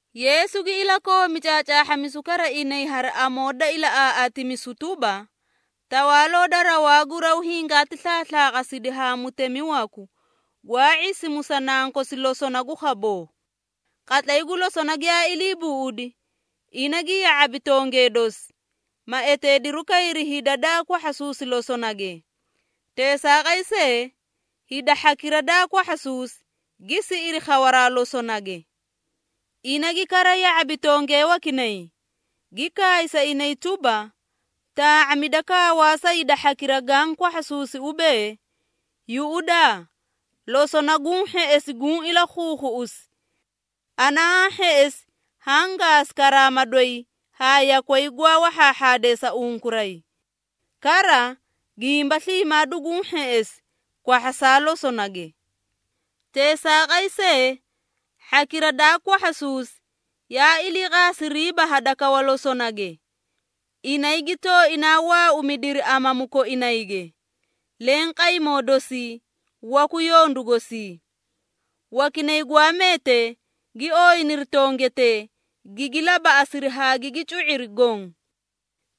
Yeesu gi ilakoomi caacaahhamisu kara inay hari amoo da ilaꞌaaꞌaatimisu tuba, “Tawaaloo da rawaa gu raw hingaati slaaslaaqasidi haa mutemi waku, gwaa ⁄isimu sa nankosi losona gu khaboo. Qatlay gu losona giyaa ilii buꞌudi, ina gi ya⁄abi tongee dosi, ma eteediru kayri hida daa kwahhasuusi losonage. Teesaaqay see, hida hhakira daa kwahhasuusi, gi siꞌiri khawaraa losonage. Ina gi kara ya⁄abi tongee wakinay, gi kaay sa inay tuba, ‘Taa⁄amida kawaa sa hida hhakira gaã kwahhasuusi ubee, “Yuꞌudaa! Losona guũ hheꞌesi guũ ilakhuukhuꞌusi. Ana haã hheꞌesi haã gaasi karaama doyi haa yakway gwaa wahhaahhaadee sa unkuray. Kara, gimba sliimaa duguũ hheꞌesi, kwahhasaa losonage.” ’ Teesaaqay see, hhakira daa kwahhasuusi, yaa iliiqaasiriiba hadakawa losonage. Inay gi tooinaa waaumidiri amamu koinayge, leẽ qaymoo dosii, waku yondu gosii. Wakinay gwaa meetee, gi ooyiniri tongetee, gigi labaꞌasiri haa gigi cu⁄iri goõ.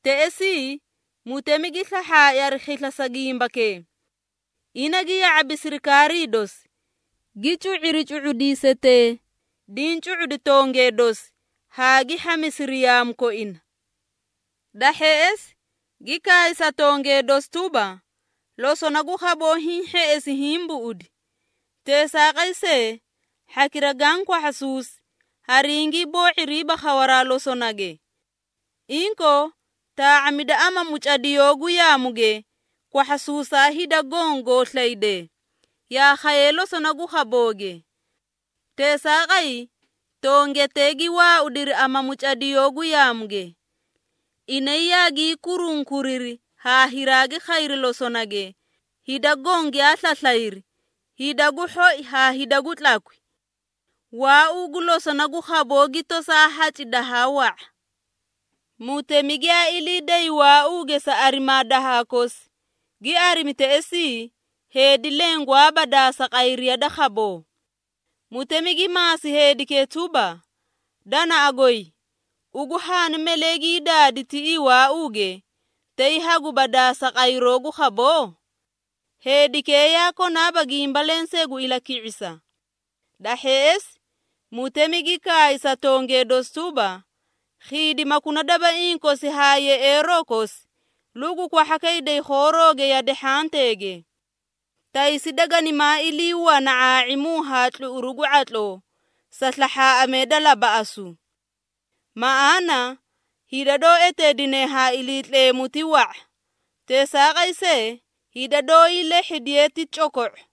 Teꞌesii, mutemi gi slahhaai hari khisla sa gimbakee. Ina gi ya⁄abi sirikaarii dosi, gi cu⁄iri cu⁄udiisetee, diĩ cu⁄udi tongee dosi, haa gi hhamisiri yaamu koina. Da hheꞌesi, gi kaay sa tongee dosi tuba, ‘Losona gu khaboo hiĩ hheꞌesi hiĩ buꞌudi. Teesaaqay see, hhakira gaã kwahhasuusi, haringii boo⁄iriiba khawaraa losonage. Inkoo, taa⁄amida amamu cadiyoo gu yaamuge, kwahhasuusaa hida goõ goo slaydee, yaa khayee losona gu khabooge.’ Teesaaqay, tongetee gi waaudiri amamu cadiyoo gu yaamuge. Inay yaagii kurunkuriri haa hiraagi khayri losonage, hida goõ giyaa slaslayri, hida gu hhoi haa hida gu tlakwi. Waauu gu losona gu khaboo gi tosaa haci dahaa wa⁄a. Mutemi giyaa ilii day waauuge sa arimaa dahha kosi, gi arimi teꞌesii, heedi leẽ gwaaba daasa qayriya da khaboo. Mutemi gi maasi heedikee tuba, ‘Danaꞌa goy, ugu haani malee gii daadi tiꞌii waauuge, tay haguba daasa qayroo gu khaboo?’ Heedikee yaa konaaba gimba lensee gu ilaki⁄isa. Da hheꞌesi, mutemi gi kaay sa tongee dosi tuba, ‘Khiidimakuna dabaiĩ kosi haa yeꞌeeroo kosi, lugu kwahhakayday khoorooge yade hhanteege. Taysi daganimaa ilii wana ⁄aa⁄imu haa tluꞌuru gu ⁄atloo, sa slahhaaꞌamee da labaꞌasu.’ Maꞌaana, hida doó eteedine ha Iliitleemu ti wa⁄a. Teesaaqay see, hida doóyii lehhidiye ti coko⁄o.”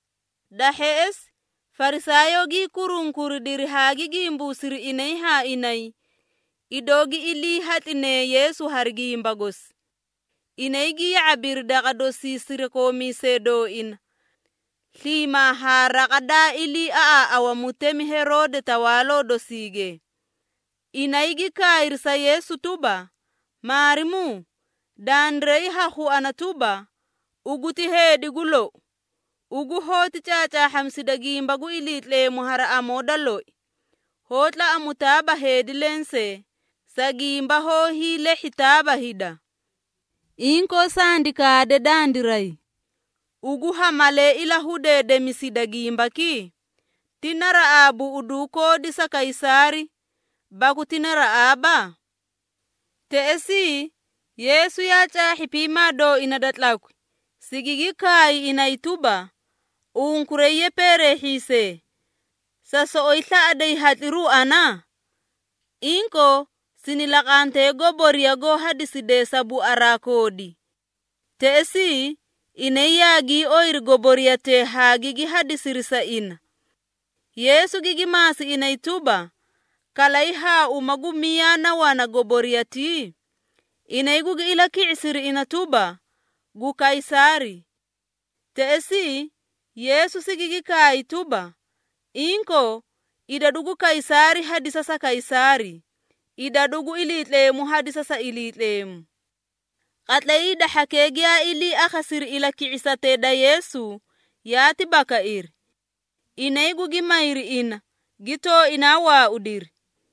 Da hheꞌesi, Farisaayoo gii kurunkuridiri haa gi gimbuusiri inay haa inay, idoo gi ilii hatlinee Yeesu hari gimba gosi. Inay gi ya⁄abiri daqa dosii sirakoomiisee dooina, sliimaa haa raqa daa iliiaꞌaaꞌawa mutemi Heroode tawaaloo dosiige. Inay gi kaayri sa Yeesu tuba, “Maarimuu, dandiray ha khuana tuba, ugu ti heedi gu lou. Ugu hoóti caacaahhamisida gimba gu Iliitleemu hari amoo da loi, hoó tlaꞌamutaaba heedi lensee, sa gimba hoó hiilehhitaaba hida. Inkoo sandi kaade dandiray, ugu ha malee ilahudeedemisida gimbaki? Ti naraꞌaa buꞌuduu koodi sa Kaysaari, baku ti naraꞌaaba?” Teꞌesii, Yeesu yaa caahhi piimaa dooina da tlakwi, sigigi kaay inay tuba, “Unkuray ye peereehhiisee! Sa soꞌoyi slaꞌaday hatliru ana? Inkoo, Sini laqantee goboriya goó hadisidee sa buaraa koodi.” Teꞌesii, inay yaagii oyiri goboriyatee haa gigi hadisiri sa ina. Yeesu gigi maasi inay tuba, “Kalay haa uma gu miyaa na wana goboriyatii?” Inay gugi ilaki⁄isiri ina tuba, “Gu Kaysaari.” Teꞌesii, Yeesu sigigi kaay tuba, “Inkoo, idadu gu Kaysaari hadisa sa Kaysaari, idadu gu Iliitleemu hadisa sa Iliitleemu.” Qatlay hida hhakee giyaa ilii akhasiri ilaki⁄isatee da Yeesu, yaati bakairi. Inay gugi mayri ina, gi tooinaa waaudiri.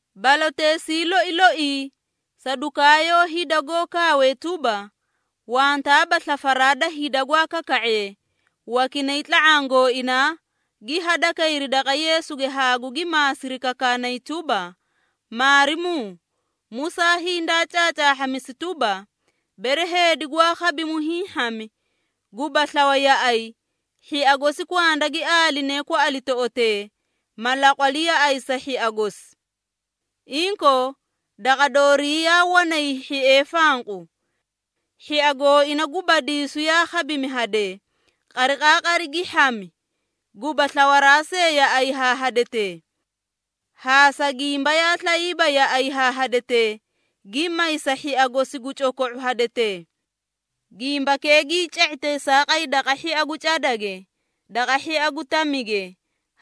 Baloteesii loi loii, Sadukaayoo hida goó kaawee tuba, wantaaba slafaraa da hida gwaa kaka⁄ee, wakinay tla⁄aã gooinaa, gi hadakayri daqa Yeesuge haa gugi maasiri kakaanay tuba, “Maarimuu, Musaa hindaa caacaahhamisi tuba, bere heedi gwaa khabimu hiĩ hhami, guba slawa yaꞌay, hhia gosi kwanda gi aaline kwaꞌalitoꞌotee, ma laqwali yaꞌay sa hhia gosi. Inkoo, daqa doorii yaa wanay hhiee fanqu. Hhia gooina gu badiisu yaa khabimi hadee, qariqaaqari gi hhami, guba slawaraa see yaꞌay haa hadetee. Haa sa gimba yaa slayiiba yaꞌay haa hadetee, gi may sa hhia gosi gu coko⁄u hadetee. Gimbakee gii ca⁄i teesaaqay daqa hhia gu cadage, daqa hhia gu tamige,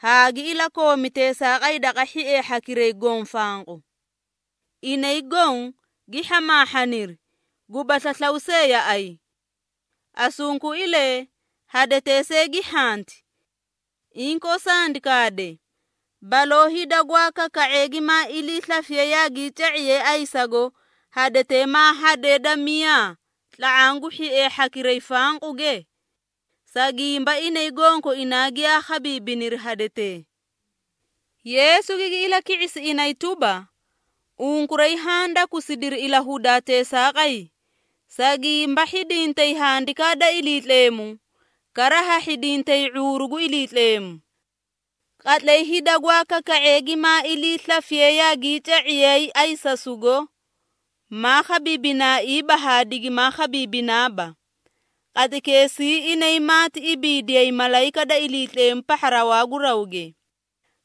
haa gi ilakoomi teesaaqay daqa hhiee hhakiray goõ fanqu. Inay goõ gi hhamaahhaniri, guba slaslaw see yaꞌay. Asunkuilee hadetee see gi hhanti. Inkoo sandi kaade, baloo hida gwaa kaka⁄ee gimaa iliislafisiye yaagii ca⁄iyay ayisasugo, hadetee maa hadee da miyaa tla⁄aã gu hhiee hhakiray fanquge? Sa gimba inay gonkoinaa giyaa khabiibiniri hadetee.” Yeesu gigi ilaki⁄isi inay tuba, “Unkuray haã dakusidiri ilahudaa teesaaqay, sa gimba hhidintay Handikaa da Iliitleemu, kara ha hhidintay ⁄uuru gu Iliitleemu. Qatlay hida gwaa kaka⁄ee gimaa iliislafiyee yaagii ca⁄iyay ayisasugo, maa khabiibinaaiiba haa digimaa khabiibinaaba. Qatlaykeesii inay maati ibiidiyay malayika da Iliitleemu pahha rawaa gu rawge.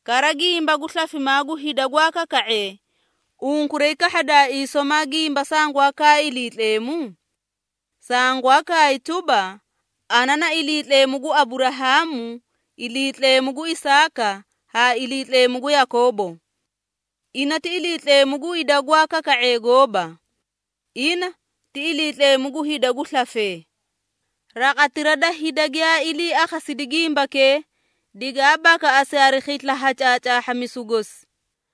Kara gimba gu slafimaa gu hida gwaa kaka⁄ee, unkuray kahhadaaii somaa gimba sangwaa kaay Iliitleemu? Sangwaa kaay tuba, ‘Ana na Iliitleemu gu Aburahaamu, Iliitleemu gu Isaaka haa Iliitleemu gu Yakoobo.’ Ina ti Iliitleemu gu hida gwaa kaka⁄ee gooba. Ina, ti Iliitleemu gu hida gu slafee.” Raqatira da hida giyaa ilii akhasidi gimbakee, digaa bakaꞌasi hari khisla ha caacaahhamisu gosi.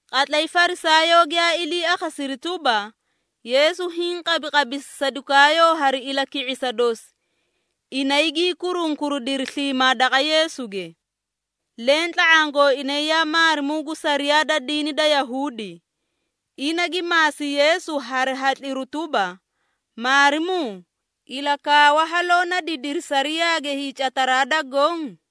Qatlay Farisaayoo giyaa ilii akhasiri tuba, Yeesu hiĩ qabiqabisi Sadukaayoo hari ilaki⁄isa dosi, inay gii kurunkuridiri sliimaa daqa Yeesuge. Leẽ tla⁄aã gooinay yaa maarimuu gu sariyaa da diini da Yahuudi, ina gi maasi Yeesu hari hatliru tuba, “Maarimuu, ilakaawa haloo na didiri sariyaage hiicataraa da goõ?”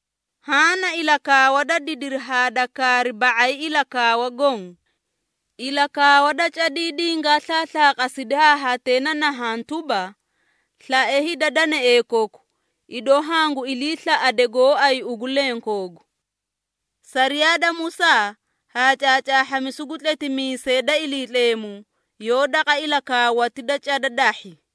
Haã na ilakaawa da didiri haa da kaari ba⁄ay ilakaawa goõ. Ilakaawa da cadii dingaa slaaslaaqasidi haa hatee na nahaã tuba, ‘Slae hida danaee koku, idoo hangu iliislaꞌade gooay ugu lenkoogu.’ Sariyaa da Musaa, haa caacaahhamisu gu tletimiisee da Iliitleemu, yoó daqa ilakaawati da cada dahhi.”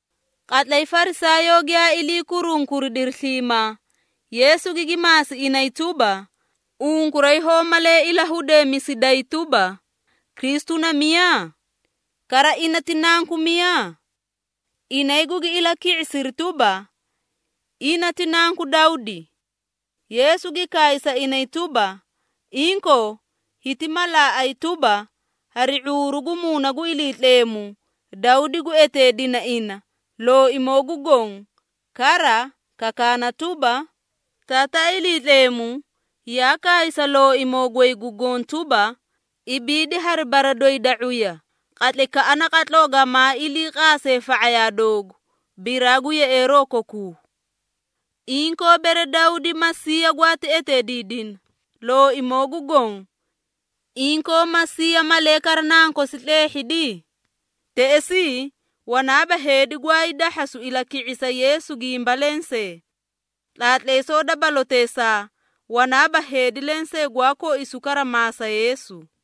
Qatlay Farisaayoo giyaa ilii kurunkuridiri sliimaa, Yeesu gigi maasi inay tuba, “Unkuray hoó malee ilahudeemisiday tuba, Kristu na miyaa? Kara ina ti Nanku miyaa?” Inay gugi ilaki⁄isiri tuba, “Ina ti Nanku Dawdi.” Yeesu gi kaay sa inay tuba, “Inkoo, hiti malaaꞌay tuba, hari ⁄uuru gu Muuna gu Iliitleemu, Dawdi gu eteedina ina ‘Looimoo gu Goõ,’ kara, kakaana tuba, Taataa Iliitleemu, yaa kaay sa Looimoo goy gu Goõ tuba, ‘Ibiidi hari bara doyi da ⁄uya, qatlaykaꞌa naqatloo gamaa ilii qaase fa⁄ayaa doogu, biraa gu yeꞌeeroo kokuu.’ Inkoo, bere Dawdi, Masiiya gwaati eteediidina, ‘Looimoo gu Goõ.’ Inkoo Masiiya malee kara nankosi tleehhidi?” Teꞌesii, wanaaba heedi gwaay dahhasu ilaki⁄isa Yeesu gimba lensee. Tlaatleesoo da baloteesaa, wanaaba heedi lensee gwaa koisu kara maasa Yeesu.